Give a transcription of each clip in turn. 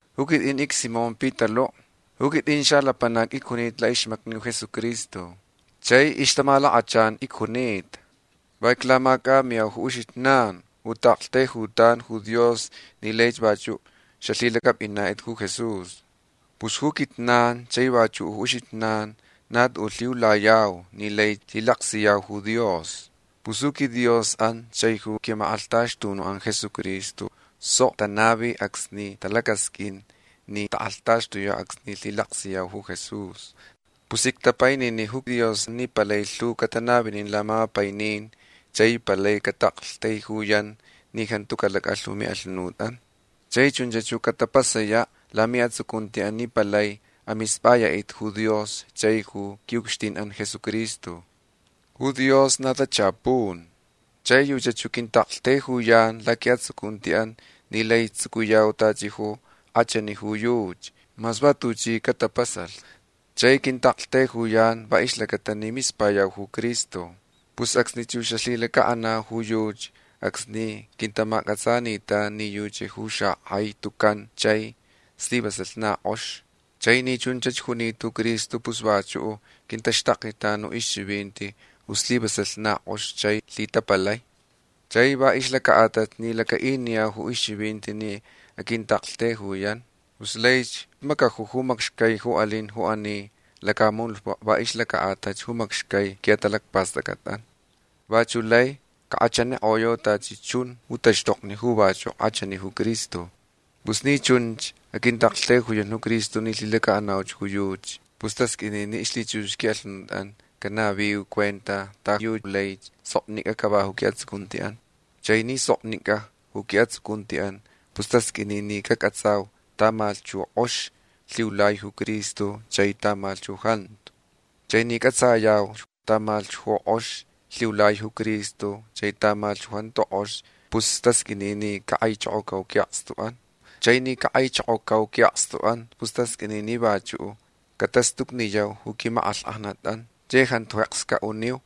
Ju quit'in icSimón Pitalu'. Ju quit'in xalapanac icjunita la'ixmacni ju Jesucristo. Chai ixtamalakachan icjunita. Va iclamac'amiyau ju uxijnan ju ta'aktaijutan ju Dios ni laich vachu' xalhilac'ap'inat'it ju Jesús. Pus ju quijnan chai vachu' ju uxijnan na tu'u' lhiulayau ni lai lhilaksiyau ju Dios. Pus ju quiDios'an chai ju qui'amak'alhtaxtunu'an Jesucristo sok tanavi acsni talacasq'uin ni tak'alhtaxtuyau acsni lhilaksiyau ju Jesús. Pus ictapainini ju Dios ni palai lhu catanavinin lamapainin chai palai cata'aktaijuyan ni jantu calac'alh ju mi'alhunut'an. Chai chunch ju catapasaya' lami'atsucunti'an ni palai amisp'aya'it'it ju Dios chai ju qui'ucxtin'an Jesucristo. Ju Dios na tachapun. Chai yuchach ju quinta'aktaijuyan laqui'atsucunti'an ni lai tsucuyau tachi ju k'achani ju yuchi mas va tuchi catapasalh. Chai quinta'aktaijuyan va ixlacata ni mispayauch ju Cristo. Pus acsnich ju xalhilaca'anau ju yuchi acsni quintamac'atsanitan ni yuchach ju xak'ai tucan chai slivasalh na k'ox. Chai ni chunch junita ju Cristo pus vachu' quintaxtaknitan ju ixchivinti ju slivasalh na k'ox chai lhitapalai. Chai va ixlaca'atalh ni laca'iniyau ju ixchivinti ni aquinta'aktaijuyan pus laich macaju ju macxcai ju alin ju ani lacamunutpa' va ixlaca'atalh ju macxcai qui'atalacpast'ac'at'an. Vachu' lai cak'achanik'oyau tachi chun ju taxtokni ju vachu' k'achani ju Cristo. Pus ni chunch aquinta'aktaijuyan ju Cristo ni lhilaca'anauch ju yuchi pus tasq'uini ni ixlhichux qui'alhunut'an canaviu cuenta ta yu lai soknic'a cava ju qui'atsucunti'an. Chai ni soknic'a ju qui'atsucunti'an pus tasq'uini ni cac'atsau tamalhch ju k'ox lhiulai ju Cristo chai tamalhch ju jantu. Chai ni c'atsayauch tamalhch ju k'ox lhiulai ju Cristo chai tamalhch ju jantu k'ox pus tasq'uini ni cak'aichokocau qui'akstu'an. Chai ni cak'aichokocau qui'akstu'an pus tasq'uini ni vachu' catastucniyau ju quimak'alhk'ajnat'an chai jantu jeks ca'uniu.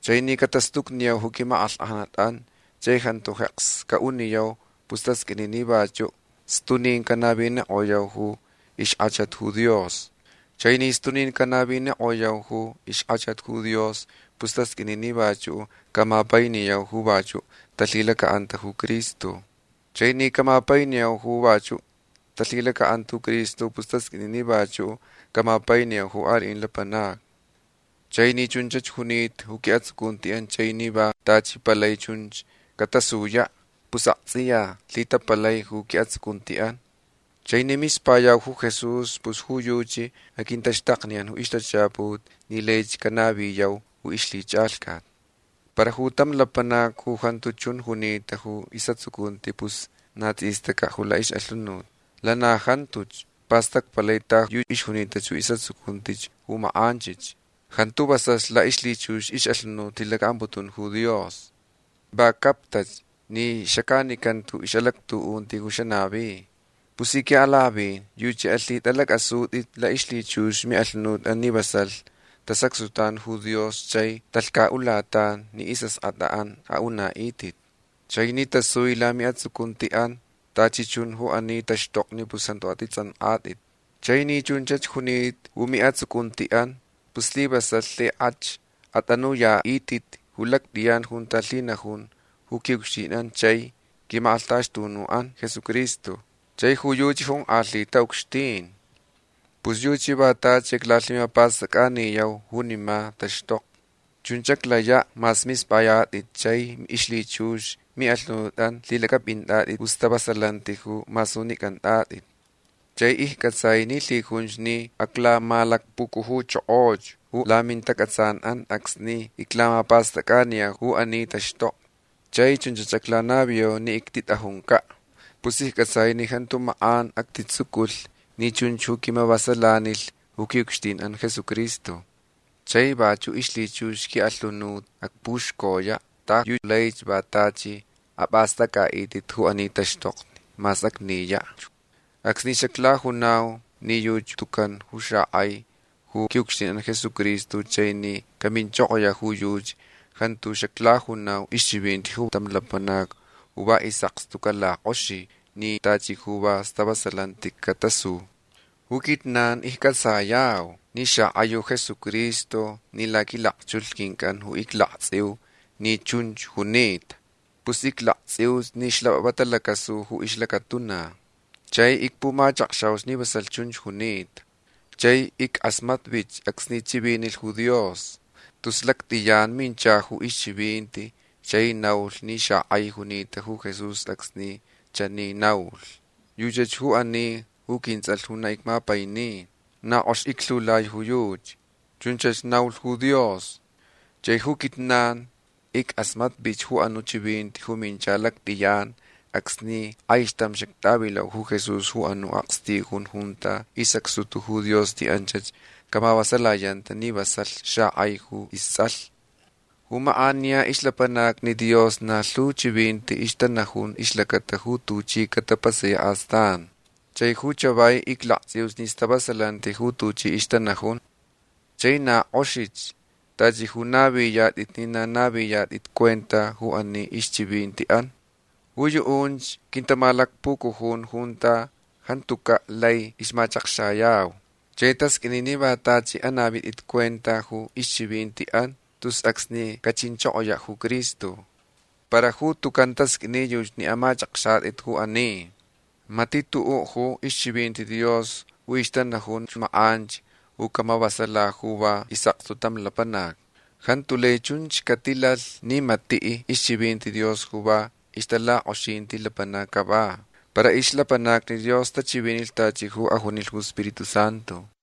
Chai ni catastucniyau ju quimak'alhk'ajnat'an chai jantu jeks ca'uniyau pus tasq'uini ni vachu' stunin canavinik'oyau ju ixk'achat ju Dios. Chai ni stunin canavinik'oyau ju ixk'achat ju Dios pus tasq'uini ni vachu' camapainiyau ju vachu' talhilaca'anta ju Cristo. Chai ni camapainiyau ju vachu' talhilaca'anta ju Cristo pus tasq'uini ni vachu' camapainiyau ju ali'in lapanacni. Chai ni chunch junita ju qui'atsucunti'an chai ni va tachi palai chunch catasuya' pus akts'iya lhitapalai ju qui'atsucunti'an. Chai ni mispayauch ju Jesús pus ju yuchi aquintaxtakniyan ju ixtachaput ni laich canaviyau ju ixlhich'alhcat. Para ju tam lapanac ju jantu chun junita ju is'atsucunti pus na ts'istaca' ju la'ix'alhunut. Lana jantuch pastacpalai ta yu ixjunita ju is'atsucunti ju mak'anchich. Jantu vasalh la'ixlhichux ix'alhunut lhilaca'amputun ju Dios. Va captach ni xac'anicanta ju ix'alactu'unti ju xanavi. Pus ji qui'alak'avin yuchi alhit'alac'asut'it la'ixlhichux mi'alhunut'an ni vasalh tasacxtutan ju Dios chai talhca'ulatan ni is'ask'at'an a'una'it'it. Chai ni tasui lami'atsucunti'an tachi chun ju ani taxtokni pus jantu at'its'ank'at'it. Chai ni chunch junita ju mi'atsucunti'an pus slivasalh lhik'ach at'anuya'it'it ju lact'iyan junta lhinajun ju qui'ucxtin'an chai qui'amak'alhtaxtunu'an Jesucristo. Chai ju yuchi jonk'alhita ucxtin. Pus yuchi va tachi aclalhimapast'ac'aniyau junima taxtokni. Chunch aclaya' mas misp'ayat'itch chai ixlhichux mi'alhunut'an lhilac'ap'int'at'it ju stavasalanti ju masunic'ant'at'it. Chai icc'atsai ni lhijunch ni aclamalacpucujuchokoch ju lamintac'atsan'an acsni iclamapast'ac'aniyau ju ani taxtokni. Chai chunch aclanaviyau ni ictit'ajunca'. Pus icc'atsai ni jantu mak'an actitsuculh ni chunch ju quimavasalanilh ju qui'ucxtin'an Jesucristo. Chai vachu' ixlhichux qui'alhunut acpuxcoya' ta yu laich va tachi ap'ast'ac'a'it'it ju ani taxtokni mas acniyach. Acsni xaclajunau ni yuchi tucan ju xak'ai ju qui'ucxtin'an Jesucristo chai ni caminchokoya' ju yuchi jantu xaclajunau ixchivinti ju tam lapanac ju va is'akstu calak'oxi ni tachi ju va stavasalanti catasu. Ju quijnan icc'atsayau ni xak'ai ju Jesucristo ni laquilakchulh quinc'an ju iclakts'iuch ni chunch junita. Pus iclakts'iuch ni xlap'ap'ap'a talacasu ju ixlacatuna. Chai icpumachakxauch ni vasalh chunch junita. Chai ick'asmatvich acsni chivinilh ju Dios. Tus lact'iyan mincha ju ixchivinti chai naulh ni xak'ai junita ju Jesús acsni chani naulh: “Yuchach ju ani ju quints'alh ju na icmapaini. Na k'ox iclhiulai ju yuchi”. Chunch naulh ju Dios. Chai ju quijnan ick'asmatvich ju anu' chivinti ju mincha lact'iyan acsni k'aixtam xact'avilau ju Jesús ju anu' akstijun junta isacxtuta ju Dios ni anch camavasalayanta ni vasalh xak'ai ju ists'alh. Ju mak'aniya ixlapanacni Dios na lhu chivinti ixtanajun ixlacata ju tuchi catapasaya' astan. Chai ju chavai iclakts'iuch ni stavasalanti ju tuchi ixtanajun. Chai na k'oxich tachi ju naviyat'it ni na naviyat'it cuenta ju ani ixchivinti'an. Ju yu'unch quintamalacpucujun junta jantuca' lai ixmachakxayau. Chai tasq'uini ni va tachi anavit'it cuenta ju ixchivinti'an tus acsni cachinchokoya' ju Cristo. Para ju tucan tasq'uini yuchi ni amach'akxat'it ju ani. Mati' tu'u' ju ixchivinti Dios ju ixtanajunch mak'anch ju camavasala ju va is'akstu tam lapanac. Jantu lai chunch catilalh ni mati' ixchivinti Dios ju va ixtalak'oxinti lapanac cava. Para ixlapanacni Dios tachivinilh tachi ju ajunilh ju Spiritu Santu.